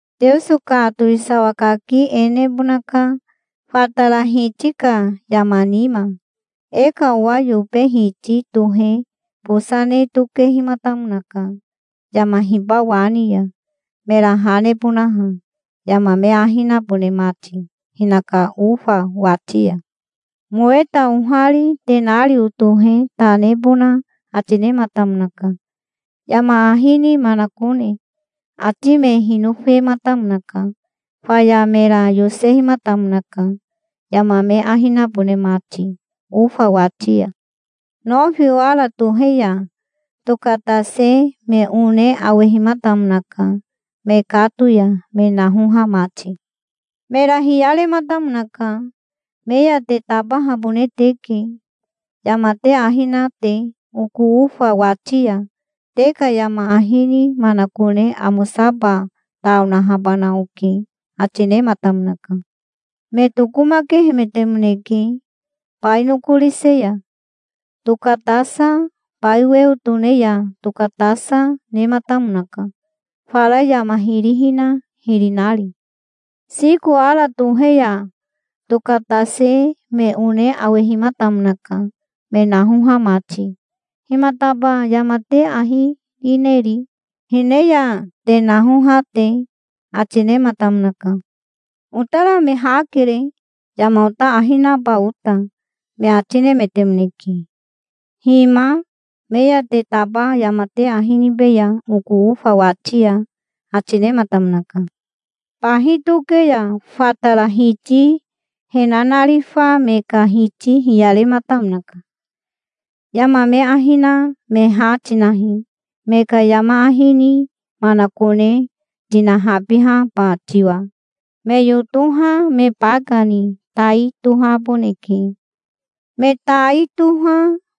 "Teoso ka towisawa kaki e nebonaka, fatara hiti ka yama nima. E ka owa yobe hiti tohe bosa ne tokehimatamonaka yama hiba wa ni ya, mera ha nebonaha, yama me ahi nabone mati hinaka ofa wati ya. Moweta ohari tenario tohe ta nebona ati nematamonaka, yama ahi ni manakone. Ati me hinofematamonaka. Faya mera yosehimatamonaka, yama me ahi nabone mati ofa wati ya. Nofi ora tohe ya tokatase me one awehimatamonaka, mekato ya me nahoha mati". "Mera hiyarematamonaka. 'Me ya te tabahabone teke yama te ahi na te oko ofa wati ya. Te ka yama ahi ni manakone amosaba ta onahabana oke', ati nematamonaka". "Me tokomakehemetemoneke. Bai nokorise ya tokatasa, bai weo tone ya tokatasa, nematamonaka, fara yama hiri hina hiri nari". "Siko ora tohe ya tokatase me one awehimatamonaka, me nahoha mati. 'Himataba yama te ahi rineri, hine ya te naoha te?' ati nematamonaka". "'Otara me ha kere, yama ota ahi naba ota', me ati nemetemoneke". "'Hima, me ya te taba yama te ahi nibeya oko ofa wati ya', ati nematamonaka". "Bahi toke ya fatara hiti he nanarifa me ka hiti hiyarematamonaka. 'Yama me ahi na me ha tinahi, me ka yama ahi ni manakone tinahabihaba tiwa. Me yotoha me baka ni tai tohaboneke. Me tai toha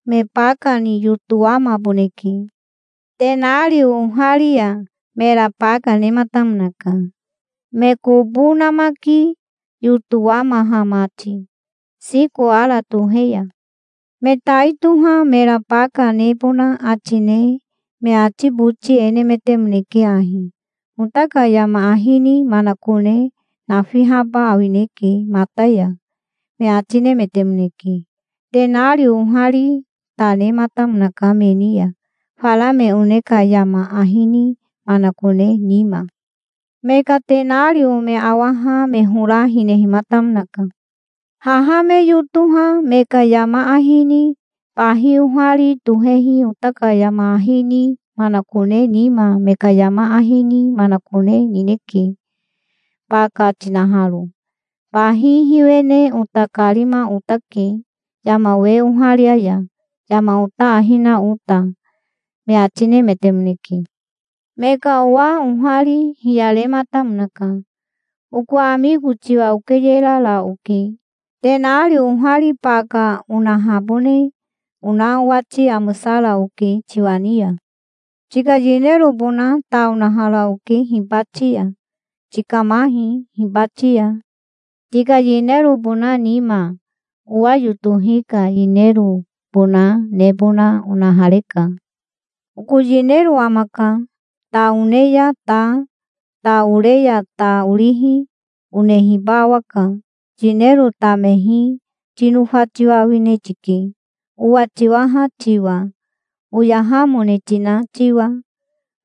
me baka ni yotowamaboneke'". "Tenario ohari ya mera baka nematamonaka, me kobo namaki yotowamaha mati, siko ora tohe ya". "Me tai toha mera baka nebona ati ne me ati boti e nemetemoneke ahi: 'Ota ka yama ahi ni manakone nafihaba awineke mata ya', me ati nemetemoneke". "Tenario ohari ta nematamonaka me ni ya, fara me one ka yama ahi ni manakone nima". "Me ka tenario me awaha me hora hinehimatamonaka. 'Haha me yotoha me ka yama ahi ni bahi ohari tohehi ota ka yama ahi ni manakone nima me ka yama ahi ni manakone nineke, baka tinaharo. Bahi hiwene ota karima otake yama we oharia ya, yama ota ahi na ota', me ati nemetemoneke'". '"Me ka owa ohari hiyarematamonaka. 'Oko amiko tiwa okeyerara oke. Tenario ohari baka onahabone ona owati amosara oke tiwa ni ya. Tika yinerobona ta onahara oke hibati ya. Tikamahi hibati ya. Tika yinerobona nima owa yotohi ka yinerobona nebona onahareka. Oko yinero amaka. Ta one ya ta, ta ore ya ta orihi onehiba awaka. Yinero tamehi tinofa tiwa awine tike, owa tiwaha tiwa, oyahamone tina tiwa',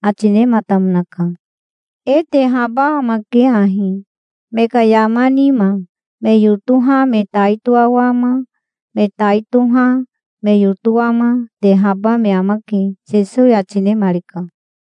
ati nematamonaka". "E tehaba amake ahi, me ka yama nima. Me yotoha me tai toawama, me tai toha me yotowama, tehaba me amake", Sesowi ati nemarika.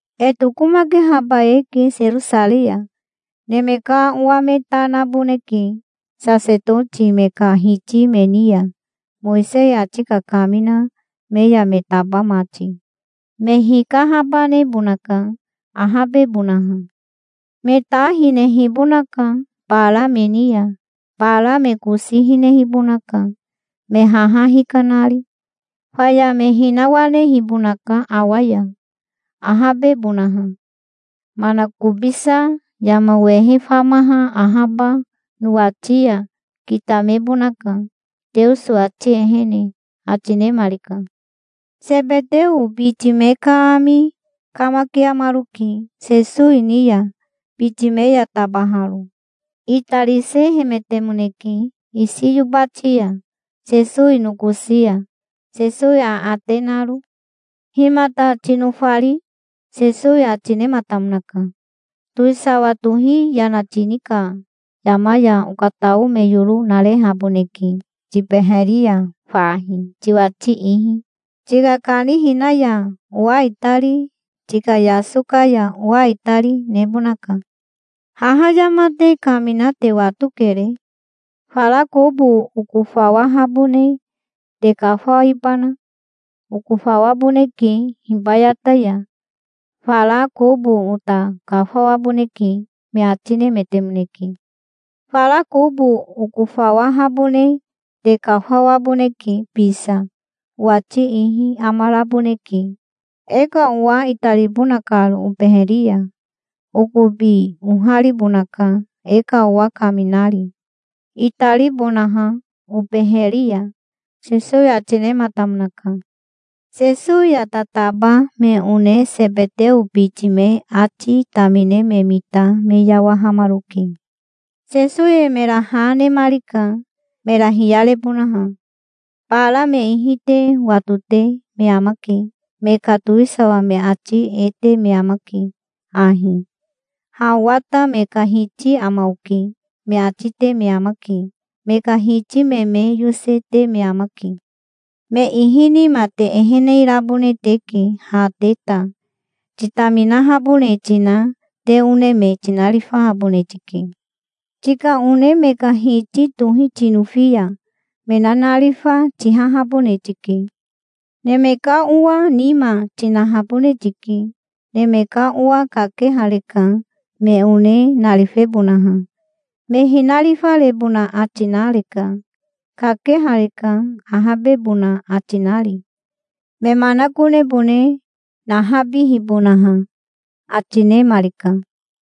"E tokomakehaba eke Serosarei ya. Neme ka Owa me ta naboneke sasetoti me ka hiti me ni ya, Mowisei ati kakamina me ya me taba mati. Me hikahabanebonaka, ahabebonaha. Me ta hinehibonaka bara me ni ya. Bara me kosi hinehibonaka, me haha hikanari. Faya me hinawanehibonaka awa ya, ahabebonaha. Manakobisa yama wehe famaha ahaba nowati ya kitamebonaka Teoso ati ehene", ati nemarika. Sebeteo biti me ka ami kamakiamaroke Sesowi ni ya, biti me ya tabaharo. Itarisehemetemoneke isi yobati ya, Sesowi nokosi ya, Sesowi aate naro. "Himata tinofari?" Sesowi ati nematamonaka. "Towisawa tohi yana tini ka yama ya okatao me yoro narehaboneke tibeheri ya fahi, tiwati ihi. Tika kanihina ya owa itari, tika yasoka ya owa itari, nebonaka". "Haha yama te kamina te watokere. Fara kobo okofawahabone te kafawibana? Okofawaboneke hibayata ya". "Fara kobo ota kafawaboneke", me ati nemetemoneke. "Fara kobo okofawahabone te kafawaboneke bisa. Owati ihi amaraboneke, e ka owa itaribona karo obeheri ya. Okobi oharibonaka, e ka owa kaminari, itaribonaha obeheri ya", Sesowi ati nematamonaka. Sesowi ya tataba me one Sebeteo biti me ati tamine me mita me yawahamaroke. Sesowi mera ha nemarika, mera hiyarebonaha. "Bara me ihi te watote me amake. Me ka towisawa me ati e te me amake ahi: 'Ha owa ta me ka hiti ama oke', me ati te me amake. Me ka hiti me me yose, te me amake. Me ihi nima te ehene rabone teke ha te ta. Titaminahabone tina te one me tinarifahabone tike. Tika one me ka hiti tohi tinofi ya me nanarifa tihahabone tike. Neme ka Owa nima tinahabone tike. Neme ka Owa kakehareka, me one narifebonaha. Me hinarifarebona ati nareka. Kakehareka, ahabebona ati nari, me manakonebone nahabibonaha", ati nemarika.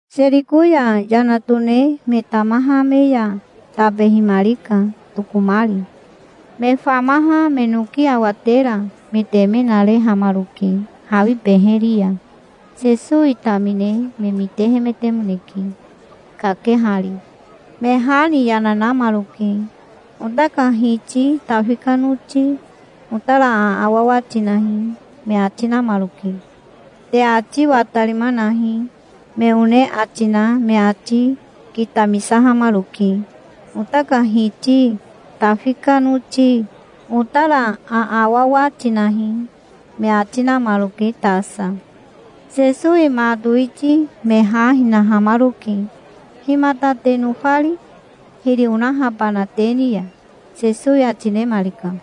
Seriko ya yana tone me tamaha me ya tabehimarika, tokomari. Me famaha me noki awatera me teme narehamaroke hawi beheri ya. Sesowi tamine me mitehemetemoneke, kakehari. Me ha ni yana namaroke. "Ota ka Hiti, Tafi ka noti, otara aawawa tinahi", me ati namaroke. "Te ati watarima nahi", me one ati na me ati kitamisahamaroke. "Ota ka Hiti, Tafi ka noti, otara aawawa tinahi", me ati namaroke tasa. Sesowi ma towiti me ha hinahamaroke. "Himata te nofari, hiri onahabana te ni ya?" Sesowi ati nemarika.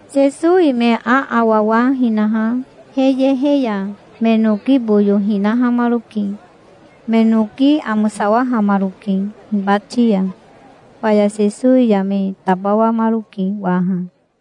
Sesowi me aawawa hinaha he yehe ya me noki boyo hinahamaroke. Me noki amosawahamaroke hibati ya. Faya Sesowi ya me tabawamaroke waha.